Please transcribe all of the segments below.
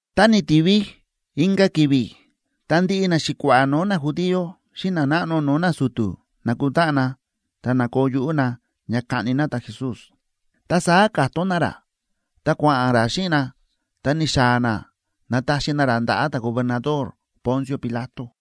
Ta ni̱tivi inka̱ ki̱vi̱ ta ndiꞌi naxi̱kua̱ꞌa̱ no̱o̱ najudío xíꞌin nanáꞌno no̱o̱ nasu̱tu̱ na̱kutáꞌan na ta na̱koo yuꞌú na ña kaꞌni na ta̱Jesús. Ta saá ka̱tón na ra, ta kua̱ꞌa̱n ra xíꞌin na, ta ni̱xaa̱ na na̱taxi na ra ndaꞌa̱ ta̱gobernador Poncio Pilato.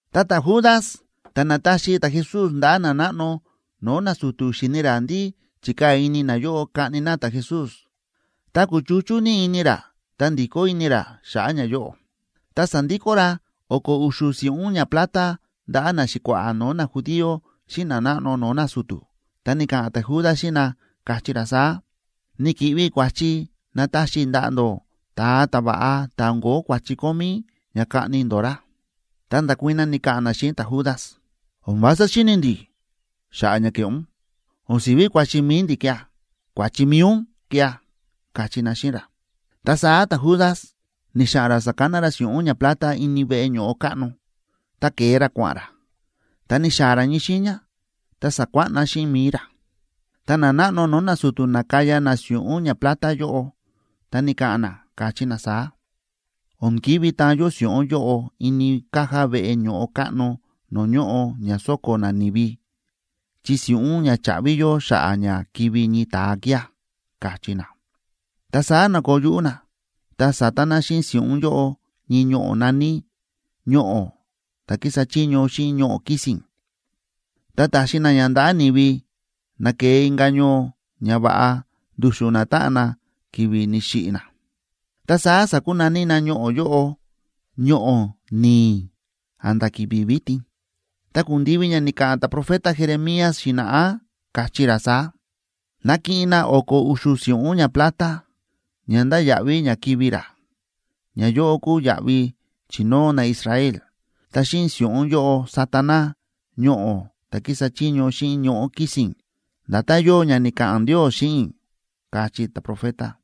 Ta ta̱Judas ta̱ na̱taxi ta̱Jesús ndaꞌa̱ nanáꞌno no̱o̱ nasu̱tu̱, xi̱ni̱ ra ndí chi̱kaa̱ ini nayóꞌo kaꞌni na ta̱Jesús, ta kúchuchú ní ini ra ta ndi̱kó ini ra xa̱ꞌa̱ ñayóꞌo, ta sa̱ndikó ra o̱ko̱ u̱xu̱ si̱ꞌún ñaplata ndaꞌa̱ naxi̱kua̱ꞌa̱ no̱o̱ najudío xíꞌin nanáꞌno no̱o̱ nasu̱tu̱. Ta ni̱ka̱ꞌa̱n ta̱Judas xíꞌin na, káchí ra saá: ―Ni̱ki̱ꞌvi i̱ kua̱chi na̱taxi i̱ ndaꞌa̱ ndó ta̱a ta̱va̱ꞌa ta̱ o̱n ko̱ó kua̱chi kómí, ña kaꞌni ndó ra. Ta nda̱kuii̱n na, ni̱ka̱ꞌa̱n na xíꞌin ta̱Judas: ―O̱n vása ndíꞌi ini ndi̱ xa̱ꞌa̱ ña ke̱ꞌé ún. O̱n si̱ví kua̱chi mi̱i ndi̱ kía̱, kua̱chi mi̱i ún kía̱ ―káchí na xíꞌin ra. Ta saá ta̱Judas ni̱xa̱ꞌa̱n ra sa̱kana ra si̱ꞌún ñaplata ini veꞌe ño̱ꞌo káꞌno, ta ke̱e ra kua̱ꞌa̱n ra. Ta ni̱xaa̱ ra ñii xiiña ta sa̱kuáꞌna xíꞌin mi̱i ra. Ta nanáꞌno no̱o̱ nasu̱tu̱ na̱kaya na si̱ꞌún ñaplata yóꞌo, ta ni̱ka̱ꞌa̱n na, káchí na saá: ―O̱n ki̱ví taan yó si̱ꞌún yóꞌo ini caja veꞌe ño̱ꞌo káꞌno no̱o̱ ñóꞌo ña sóko̱ nani̱vi, chi si̱ꞌún ña cha̱ꞌvi yó xa̱ꞌa̱ ña kivi̱ ñii ta̱a kía̱ ―káchí na. Ta saá na̱koo yuꞌú na, ta sa̱ta na xíꞌin si̱ꞌún yóꞌo ñii ñoꞌo̱ na̱ní “Ñoꞌo̱ ta̱ kísa chiño xíꞌin ñoꞌo̱ kisín”, ta ta̱xi na ña ndaꞌa̱ ni̱vi na ke̱e inka̱ ñoo ña va̱ꞌa ndu̱xu̱n natáꞌan na ki̱vi̱ ni̱xiꞌi̱ na. Ta saá sákunaní na ñoꞌo̱ yóꞌo “Ñoꞌo̱ Ni̱i̱” a̱nda̱ ki̱vi̱ vitin. Ta ku̱ndivi ña ni̱ka̱ꞌa̱n ta̱profeta Jeremías xi̱na̱ꞌá, káchí ra saá: “Na̱kiꞌin na o̱ko̱ u̱xu̱ si̱ꞌún ñaplata, ña ndáya̱ꞌví ña kivi̱ ra, ñayóꞌo kúu yaꞌvi chi̱nóo naIsrael, ta xíꞌin si̱ꞌún yóꞌo sa̱ta na ‘Ñoꞌo̱ ta̱ kísa chiño xíꞌin ñoꞌo̱ kisín’, nda̱tán yóo ña ni̱ka̱ꞌa̱n Ndios xíꞌin i̱”, káchí ta̱profeta.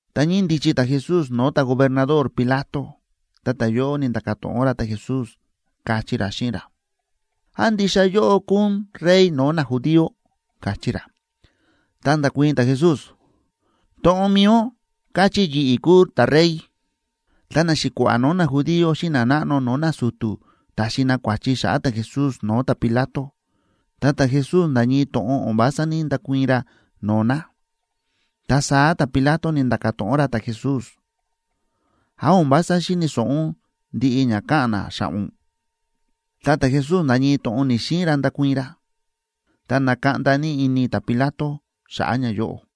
Ta ñíndichi ta̱Jesús no̱o̱ ta̱gobernador Pilato, ta ta̱yóꞌo ni̱nda̱ka̱ to̱ꞌon ra ta̱Jesús, káchí ra xíꞌin ra: ―¿Án ndixa yóꞌó kúu ún rey no̱o̱ najudío? ―káchí ra. Ta nda̱kuii̱n ta̱Jesús: ―To̱ꞌon mi̱i ún káchí yi̱ꞌi̱ kúu ta̱rey. Ta naxi̱kua̱ꞌa̱ no̱o̱ najudío xíꞌin nanáꞌno no̱o̱ nasu̱tu̱ ta̱xi na kua̱chi xa̱ꞌa̱ ta̱Jesús no̱o̱ ta̱Pilato, ta ta̱Jesús nda̱ ñii to̱ꞌon o̱n vása ní‑ndakuii̱n ra no̱o̱ na. Ta saá ta̱Pilato ni̱nda̱ka̱ to̱ꞌon ra ta̱Jesús: ―¿Án o̱n vása xíni̱ so̱ꞌo ún ndiꞌi ña káꞌa̱n na xa̱ꞌa̱ ún? Ta ta̱Jesús nda̱ ñii to̱ꞌon ni̱‑xiin ra ndakuii̱n ra. Ta na̱kaꞌnda ní ini ta̱Pilato xa̱ꞌa̱ ñayóꞌo.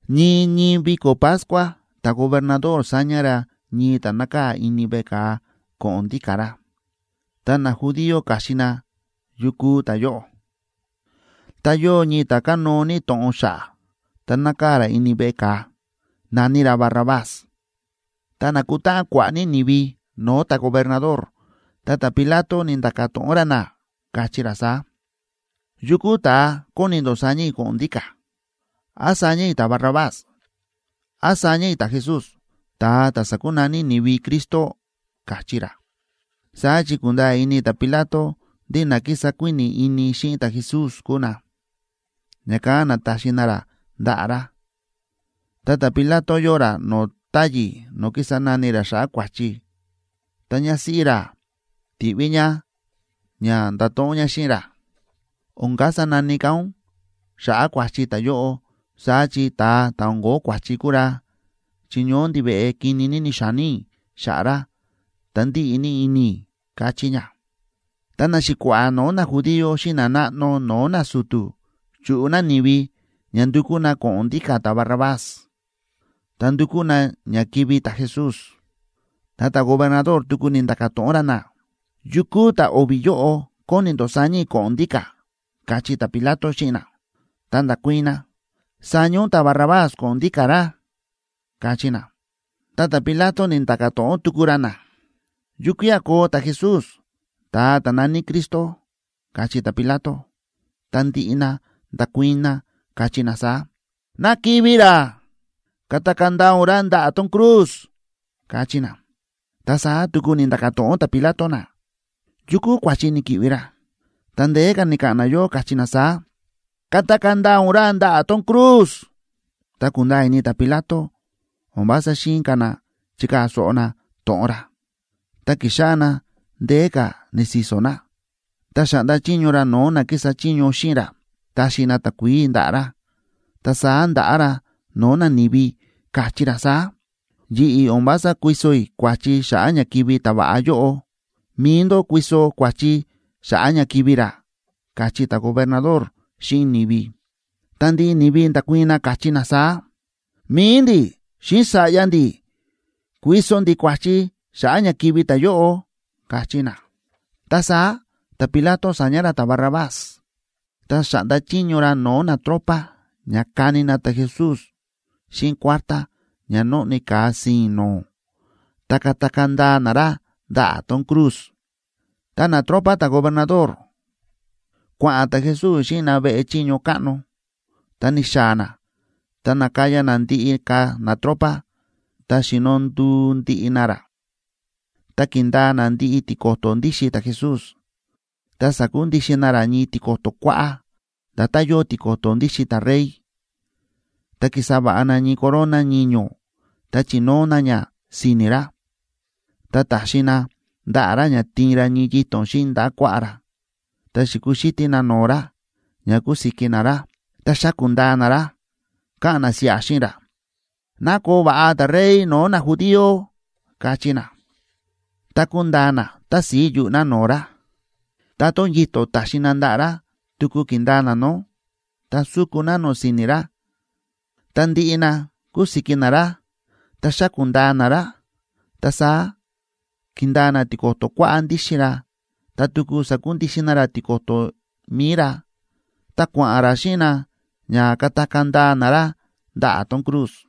Ñii ñii viko̱ Pascua ta̱gobernador sáña ra ñii ta̱ nákaa̱ ini veꞌe ka̱a ko̱ꞌo̱n ndíka̱ ra. Ta najudío káxin na yu kúu ta̱yóꞌo. Ta yóo ñii ta̱ kánóo ní to̱ꞌon xa̱ꞌa̱ ta nákaa̱ ra ini veꞌe ka̱a, na̱ní ra Barrabás. Ta na̱kutáꞌan kua̱ꞌa̱ ní ni̱vi no̱o̱ ta̱gobernador, ta ta̱Pilato ni̱nda̱ka̱ to̱ꞌon ra na, káchí ra saá: ―¿Yukú ta̱a kóni ndó saña i̱ ko̱ꞌo̱n ndíka̱? ¿Án saña i̱ ta̱Barrabás? ¿Án saña i̱ ta̱Jesús, ta̱a ta̱ sákunaní ni̱vi Cristo? ―káchí ra. Saá chi ku̱nda̱a̱ ini ta̱Pilato ndí na kísa kuíni̱ ini xíni ta̱Jesús kúu na, ña̱kán na̱taxi na ra ndaꞌa̱ ra. Ta ta̱Pilato yóo ra no̱o̱ táyi̱ no̱o̱ kísa nani ra xa̱ꞌa̱ kua̱chi, ta ñásíꞌí ra ti̱ꞌví ñá ña ndato̱ꞌon ñá xíꞌin ra: “O̱n kasa nani ka̱ ún xa̱ꞌa̱ kua̱chi ta̱yóꞌo, saá chi ta̱a ta̱ o̱n ko̱ó kua̱chi kúu ra, chi ñoó ndiveꞌe kini ní ni̱xa̱ní i̱ xa̱ꞌa̱ ra, ta ndíꞌi ní ini i̱”, káchí ñá. Ta naxi̱kua̱ꞌa̱ no̱o̱ najudío xíꞌin nanáꞌno no̱o̱ nasu̱tu̱ chúꞌu na ni̱vi ña ndukú na ko̱ꞌo̱n ndíka̱ ta̱Barrabás, ta ndukú na ña kivi̱ ta̱Jesús. Ta ta̱gobernador tuku ni̱nda̱ka̱ to̱ꞌon ra na: ―¿Yukú ta̱ o̱vi̱ yóꞌo kóni ndó saña i̱ ko̱ꞌo̱n ndíka̱? ―káchí ta̱Pilato xíꞌin na. Ta nda̱kuii̱n na: ―Saña ún ta̱Barrabás ko̱ꞌo̱n ndíka̱ ra ―káchí na. Ta ta̱Pilato ni̱nda̱ka̱ to̱ꞌon tuku ra na: ―¿Ta yukía̱ koo ta̱Jesús, ta̱a ta̱ na̱ní Cristo? ―káchí ta̱Pilato. Ta ndiꞌi na nda̱kuii̱n na, káchí na saá: ―¡Ná kivi̱ ra! ¡Katakaa̱ ndaa ún ra ndaꞌa̱ tón cruz! ―káchí na. Ta saá tuku ni̱nda̱ka̱ to̱ꞌon ta̱Pilato na: ―¿Yu kúu kua̱chi ni̱ki̱ꞌvi ra? Ta ndeé ka̱ ni̱ka̱ꞌa̱n nayóꞌo, káchí na saá: ―¡Katakaa̱ ndaa ún ra ndaꞌa̱ tón cruz! Ta ku̱nda̱a̱ ini ta̱Pilato o̱n vása xi̱in ka̱ na chikaa̱ so̱ꞌo na to̱ꞌon ra, ta ki̱xáꞌá na ndeé ka̱ ni̱si̱so̱ na. Ta xa̱ꞌnda chiño ra no̱o̱ na kísa chiño xíꞌin ra taxi na takuií ndaꞌa̱ ra, ta saá nda̱ꞌá ra no̱o̱ nani̱vi, káchí ra saá: ―Yi̱ꞌi̱ o̱n vása kuiso i̱ kua̱chi xa̱ꞌa̱ ña kivi̱ ta̱va̱ꞌa yóꞌo. Mi̱i ndó kuiso kua̱chi xa̱ꞌa̱ ña kivi̱ ra ―káchí ta̱gobernador xíꞌin ni̱vi. Ta ndiꞌi ni̱vi nda̱kuii̱n na, káchí na saá: ―¡Mi̱i ndi̱ xíꞌin sa̱ꞌya ndi̱ kuiso ndi̱ kua̱chi xa̱ꞌa̱ ña kivi̱ ta̱yóꞌo! ―káchí na. Ta saá ta̱Pilato sa̱ña ra ta̱Barrabás. Ta xa̱ꞌnda chiño ra no̱o̱ natropa ña kani na ta̱Jesús xíꞌin kuártá ña nóꞌni ka̱a si̱i̱n no̱o̱, ta katakaa̱ ndaa na ra ndaꞌa̱ tón cruz. Ta natropa ta̱gobernador, kua̱ꞌa̱n ta̱Jesús xíꞌin na veꞌe chiño káꞌno, ta ni̱xaa̱ na ta na̱kaya na ndiꞌi ka̱ natropa, ta xíno nduu ndiꞌi na ra. Ta ki̱ndaa na ndiꞌi tiko̱to̱ ndíxin ta̱Jesús ta sa̱kundixin na ra ñii tiko̱to̱ kuáꞌá, nda̱tán yóo tiko̱to̱ ndíxin ta̱rey, ta ki̱sa va̱ꞌa na ñii corona ñiño̱ ta chi̱nóo na ña si̱ni̱ ra. Ta ta̱xi na ndaꞌa̱ ra ña tiin ra ñii yito̱n xíꞌin ndaꞌa̱ kuaꞌá ra, ta xi̱kuxítí na no̱o̱ ra ña kúsiki na ra, ta xáku̱ ndaa na ra, káꞌa̱n na siꞌa xíꞌin ra: ―¡Ná koo va̱ꞌa ta̱Rey no̱o̱ najudío! ―káchí na. Ta ku̱ndaa na tási̱i yuꞌu̱ na no̱o̱ ra, ta tón yito̱n ta̱xi na ndaꞌa̱ ra tuku ki̱ndaa na nó, ta su̱ku na nó si̱ni̱ ra. Tá ndi̱ꞌi na ku̱siki na ra ta xa̱ku̱ ndaa na ra, ta saá ki̱ndaa na tiko̱to̱ kuáꞌá ndíxin ra ta tuku sa̱kundixin na ra tiko̱to̱ mi̱i ra. Ta kua̱ꞌa̱n ra xíꞌin na ña katakaa̱ ndaa na ra ndaꞌa̱ tón cruz.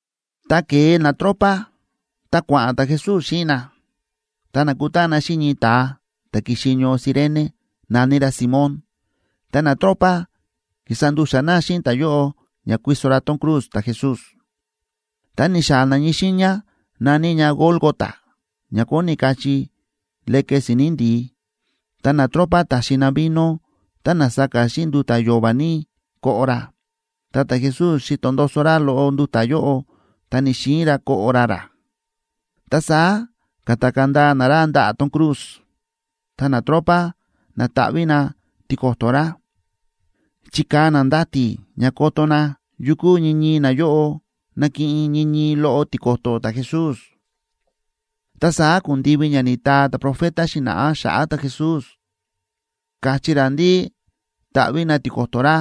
Ta ke̱e natropa, ta kua̱ꞌa̱n ta̱Jesús xíꞌin na, ta na̱kutáꞌan na xíꞌin ñii ta̱a ta̱ ki̱xi ñoo Cirene, na̱ní ra Simón, ta natropa ki̱sa ndu̱xa̱ na xíꞌin ta̱yóꞌo ña kuiso ra tón cruz ta̱Jesús. Ta ni̱xaa̱ na ñii xiiña na̱ní ña Gólgota, ña kóni kachí Leke Si̱ni̱ Ndi̱í. Ta natropa ta̱xi na vino tá na̱saka xíꞌin nduta̱ yo̱va̱ ní koꞌo ra, ta ta̱Jesús xi̱to ndoso ra loꞌo nduta̱ yóꞌo, ta ni̱‑xiin ra koꞌo ra rá. Ta saá ka̱takaa̱ ndaa na ra ndaꞌa̱ tón cruz, ta natropa na̱taꞌví na tiko̱to̱ ra. Chi̱kaa̱ na ndati̱ ña koto na yukú ñii ñii nayóꞌo nakiꞌin ñii ñii loꞌo tiko̱to̱ ta̱Jesús. Ta saá ku̱ndivi ña ni̱taa ta̱profeta xi̱na̱ꞌá xa̱ꞌa̱ ta̱Jesús, káchí ra ndí taꞌví na tiko̱to̱ ra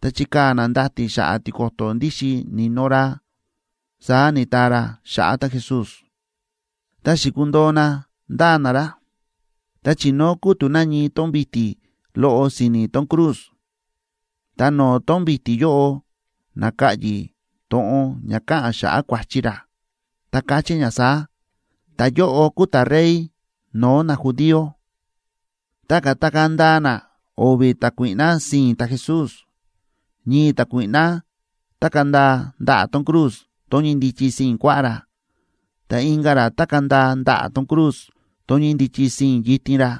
ta chikaa̱ na ndati̱ xa̱ꞌa̱ tiko̱to̱ ndíxin ni̱no ra, saá ni̱taa ra xa̱ꞌa̱ ta̱Jesús. Ta xi̱kundoo na ndáa na ra. Ta chi̱nóo kútu̱ na ñii tón vi̱ti̱ loꞌo si̱ni̱ tón cruz, ta no̱o̱ tón vi̱ti̱ yóꞌo na̱ka̱ꞌyi̱ to̱ꞌon ña káꞌa̱n xa̱ꞌa̱ kua̱chi ra, ta káchí ña saá: “Ta̱yóꞌo kúu ta̱Rey no̱o̱ najudío.” Ta ka̱takaa̱ ndaa na o̱vi̱ ta̱kuíꞌná sii̱n ta̱Jesús, ñii ta̱kuíꞌná tákaa̱ ndaa ndaꞌa̱ tón cruz tón ñíndichi sii̱n kuaꞌá ra, ta inka̱ ra tákaa̱ ndaa ndaꞌa̱ tón cruz tón ñíndichi sii̱n yitin ra.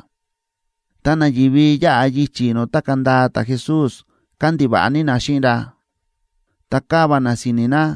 Ta nani̱vi yáꞌa yichi̱ no̱o̱ tákaa̱ ndaa ta̱Jesús kándiva̱ꞌa ní na xíꞌin ra, ta káva na si̱ni̱ na,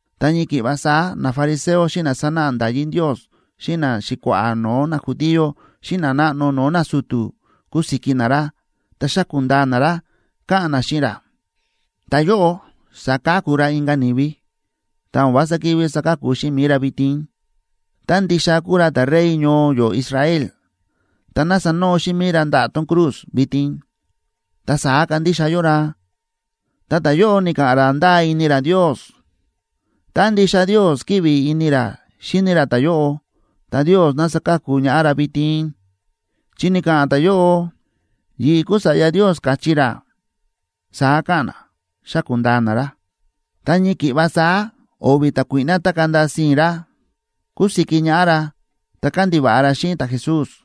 Ta ñii ki̱ꞌva saá nafariseo xíꞌin na sánáꞌa nda̱yí Ndios xíꞌin naxi̱kua̱ꞌa̱ no̱o̱ najudío xíꞌin nanáꞌno no̱o̱ nasu̱tu̱ kúsiki na ra ta xáku̱ ndaa na ra, káꞌa̱n na xíꞌin ra: ―Ta̱yóꞌo sa̱ka̱ku ra inka̱ ni̱vi, ta o̱n vása ki̱ví saka̱ku xíꞌin mi̱i ra vitin. Tá ndixa kúu ra ta̱Rey ñoo yó Israel, ta ná sanoo xíꞌin mi̱i ra ndaꞌa̱ tón cruz vitin, ta saá kandixa yó ra. Ta ta̱yóꞌo ni̱ka̱ꞌa̱n ra ndáa ini ra Ndios. Tá ndixa Ndios kíꞌvi ini ra xíni ra ta̱yóꞌo, ta Ndios ná saka̱ku ñaꞌá ra vitin, chi ni̱ka̱ꞌa̱n ta̱yóꞌo: “Yi̱ꞌi̱ kúu Sa̱ꞌya Ndios”, káchí ra ―saá káꞌa̱n na, xáku̱ ndaa na ra. Ta ñii ki̱ꞌva saá o̱vi̱ ta̱kuíꞌná tákaa̱ ndaa sii̱n ra kúsiki ñaꞌá ra ta kándiva̱ꞌa ra xíꞌin ta̱Jesús.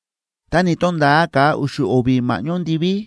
Ta ni̱to̱nda̱a ka̱a u̱xu̱ o̱vi̱ ma̱ꞌñó ndiví,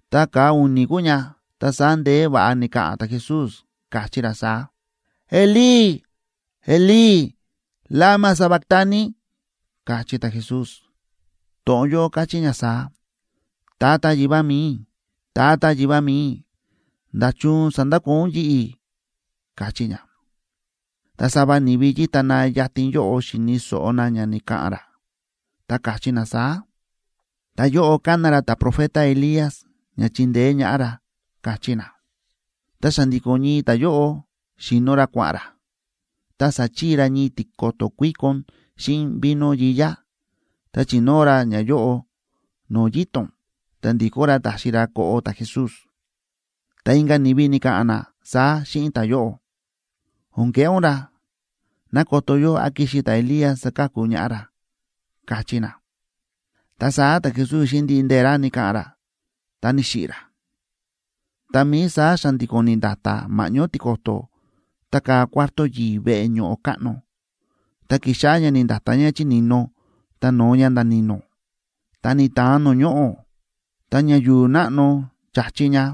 Ta ka̱a u̱ni̱ kúu ña, ta saá ndeé va̱ꞌa ni̱ka̱ꞌa̱n ta̱Jesús, káchí ra saá: ―Elí, Elí, ¿lama sabactani? ―káchí ta̱Jesús. To̱ꞌon yóꞌo káchí ña saá: Tata Yivá mi̱i i̱, Tata Yivá mi̱i i̱, ¿nda̱chun sa̱ndakoo ún yi̱ꞌi̱?, káchí ña. Ta sava ni̱vi na yíta yatin yóꞌo, xi̱ni̱ so̱ꞌo na ña ni̱ka̱ꞌa̱n ra, ta káchí na saá: ―Ta̱yóꞌo kána ra ta̱profeta Elías ña chindeé ñaꞌá ra ―káchí na. Ta xa̱ndi̱ko̱n ñii ta̱yóꞌo xíno ra kua̱ꞌa̱n ra, ta sa̱chii ra ñii tiko̱to̱ kuíkon xíꞌin vino yiyá, ta chi̱nóo ra ñayóꞌo no̱o̱ yito̱n, ta ndi̱kó ra taxi ra koꞌo ta̱Jesús. Ta inka̱ ni̱vi ni̱ka̱ꞌa̱n na saá xíꞌin ta̱yóꞌo: ―O̱n keꞌé ún ra. Ná koto yó án kixi ta̱Elías saka̱ku ñaꞌá ra ―káchí na. Ta saá ta̱Jesús xíꞌin ndiꞌi ndee̱ ra ni̱ka̱ꞌa̱n ra, ta ni̱xiꞌi̱ ra. Tá mií saá xa̱ndi̱ko̱n ni̱nda̱ta̱ ma̱ꞌñó tiko̱to̱ tákaa̱ cuarto yi̱i̱ veꞌe ño̱ꞌo káꞌno, ta ki̱xáꞌá ña ni̱nda̱ta̱ ña chi ni̱no ta no̱o ña nda̱ ni̱no̱. Ta ni̱ta̱an no̱o̱ ñoꞌo̱, ta ña yu̱u̱ náꞌno cha̱chi ña.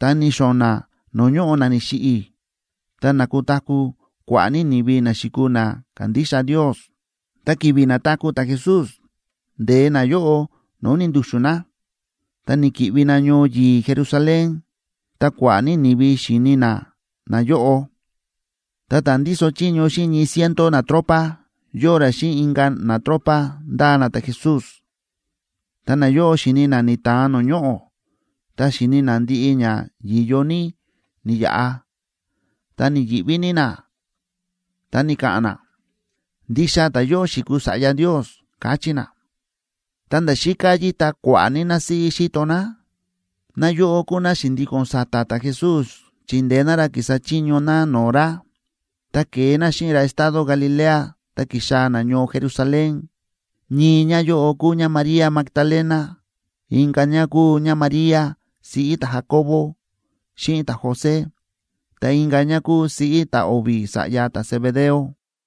Ta ni̱xo̱na̱ no̱o̱ ñóꞌo na ni̱xiꞌi̱, ta na̱taku̱ kua̱ꞌa̱ ní ni̱vi na xi̱kuu na ka̱ndixa Ndios. Ta ki̱vi̱ na̱taku̱ ta̱Jesús, nde̱e nayóꞌo no̱o̱ ni̱ndu̱xu̱n na, ta ni̱ki̱ꞌvi na ñoo yi̱i̱ Jerusalén, ta kua̱ꞌa̱ ní ni̱vi xi̱ni na nayóꞌo. Ta ta̱ ndíso chiño xíꞌin ñii ciento natropa, yóo ra xíꞌin inka̱ natropa ndáa na ta̱Jesús. Ta nayóꞌo xi̱ni na ni̱ta̱an no̱o̱ ñoꞌo̱, ta xi̱ni na ndiꞌi ña yi̱yo ní ni̱yaꞌa, ta ni̱yi̱ꞌví ní na, ta ni̱ka̱ꞌa̱n na: ―Ndixa ta̱yóꞌo xi̱kuu Sa̱ꞌya Ndios ―káchí na. Ta nda̱ xíká yíta kua̱ꞌa̱ ní násíꞌí xíto ná. Náyóꞌo kúu ná xi̱ndíko̱n sa̱ta̱ ta̱Jesús chíndeé ná ra kísa chiño ná no̱o̱ ra, ta ke̱e ná xíꞌin ra estado Galilea ta ki̱xaa̱ ná ñoo Jerusalén. Ñii ñáyóꞌo kúu ñáMaría Magdalena, inka̱ ñá kúu ñáMaría, siꞌí ta̱Jacobo xíꞌin ta̱José, ta inka̱ ñá kúu siꞌí ta̱ o̱vi̱ sa̱ꞌya ta̱Zebedeo.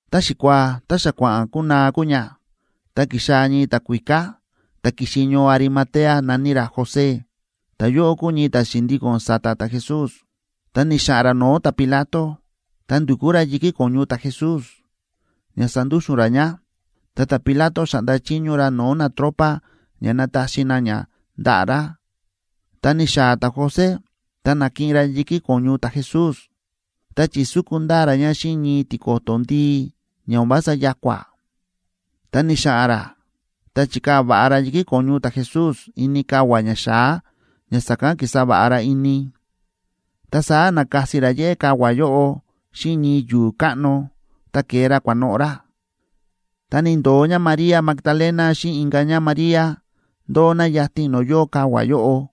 Ta xikuaa ta xa kua̱ꞌa̱n kunaa kúu ña, ta ki̱xaa̱ ñii ta̱kuíká, ta̱ ki̱xi ñoo Arimatea, na̱ní ra José. Ta̱yóꞌo kúu ñii ta̱ xi̱ndíko̱n sa̱ta̱ ta̱Jesús. Ta ni̱xa̱ꞌa̱n ra no̱o̱ ta̱Pilato, ta ndu̱kú ra yi̱kí ko̱ñu ta̱Jesús ña sandúxu̱n ra ña, ta ta̱Pilato xa̱ꞌnda chiño ra no̱o̱ natropa ña nataxi na ña ndaꞌa̱ ra. Ta ni̱xaa̱ ta̱José ta na̱kiꞌin ra yi̱kí ko̱ñu ta̱Jesús, ta chi̱súku ndaa ra ña xíꞌin ñii tiko̱to̱ ndii ña o̱n vása ya̱kua̱. Ta ni̱xa̱ꞌa̱n ra ta chi̱kaa̱ va̱ꞌa ra yi̱kí ko̱ñu ta̱Jesús ini kavua̱ ñaxa̱á ña sa̱kán ki̱sa va̱ꞌa ra ini. Ta saá na̱kasi ra yéꞌé kavua̱ yóꞌo xíꞌin ñii yu̱u̱ káꞌno, ta ke̱e ra kua̱noꞌo̱ ra. Ta ni̱ndo̱o ñáMaría Magdalena xíꞌin inka̱ ñáMaría, ndóo na yatin no̱o̱ yóo kavua̱ yóꞌo.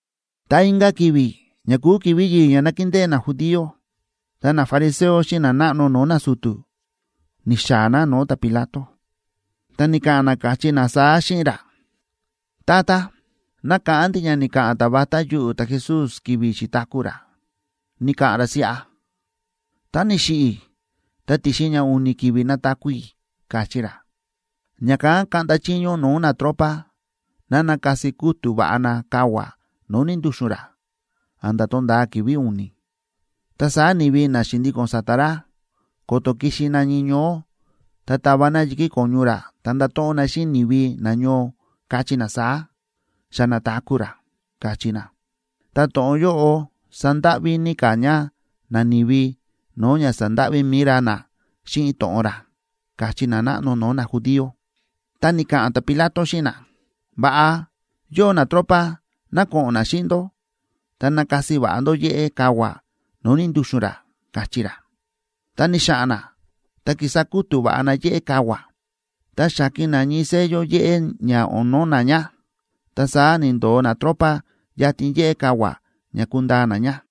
Ta inka̱ ki̱vi̱ ña kúu ki̱vi̱ yi̱i̱ ña nákindée najudío, ta nafariseo xíꞌin nanáꞌno no̱o̱ nasu̱tu̱ ni̱xaa̱ na no̱o̱ ta̱Pilato. Ta ni̱ka̱ꞌa̱n na, káchí na saá xíꞌin ra: ―Tata, nákáꞌán ndi̱ ña ni̱ka̱ꞌa̱n ta̱ vatá yuꞌu̱ ta̱Jesús ki̱vi̱ xi̱taku̱ ra, ni̱ka̱ꞌa̱n ra siꞌa: “Tá ni̱xiꞌi̱ i̱ ta ti̱xin ña u̱ni̱ ki̱vi̱ nataku̱ i̱”, káchí ra. Ña̱kán kaꞌnda chiño ún no̱o̱ natropa ná nakasi kútu̱ va̱ꞌa na kavua̱ no̱o̱ ni̱ndu̱xu̱n ra a̱nda̱ tonda̱a ki̱vi̱ u̱ni̱, ta saá ni̱vi na xi̱ndíko̱n sa̱ta̱ ra, ko̱to̱ kixi na ñii ñoó, ta tava na yi̱kí ko̱ñu ra ta ndato̱ꞌon na xíꞌin ni̱vi, kachí na saá: “Xa na̱taku̱ ra”, kachí na. Ta to̱ꞌon yóꞌo sandáꞌví ní ka̱ ña nani̱vi no̱o̱ ña sa̱ndáꞌví mi̱i ra na xíꞌin to̱ꞌon ra ―káchí nanáꞌno no̱o̱ najudío. Ta ni̱ka̱ꞌa̱n ta̱Pilato xíꞌin na: ―Va̱ꞌa, yóo natropa, ná ko̱ꞌo̱n na xíꞌin ndó. Ta nakasi va̱ꞌa ndó yéꞌé kavua̱ no̱o̱ ni̱ndu̱xu̱n ra ―káchí ra. Ta ni̱xa̱ꞌa̱n na ta ki̱sa kútu̱ va̱ꞌa na yéꞌé kavua̱, ta xa̱ki̱n na ñii sello yéꞌé ña o̱n no̱na̱ ña, ta saá ni̱ndo̱o natropa yatin yéꞌé kavua̱ ña kundaa na ña.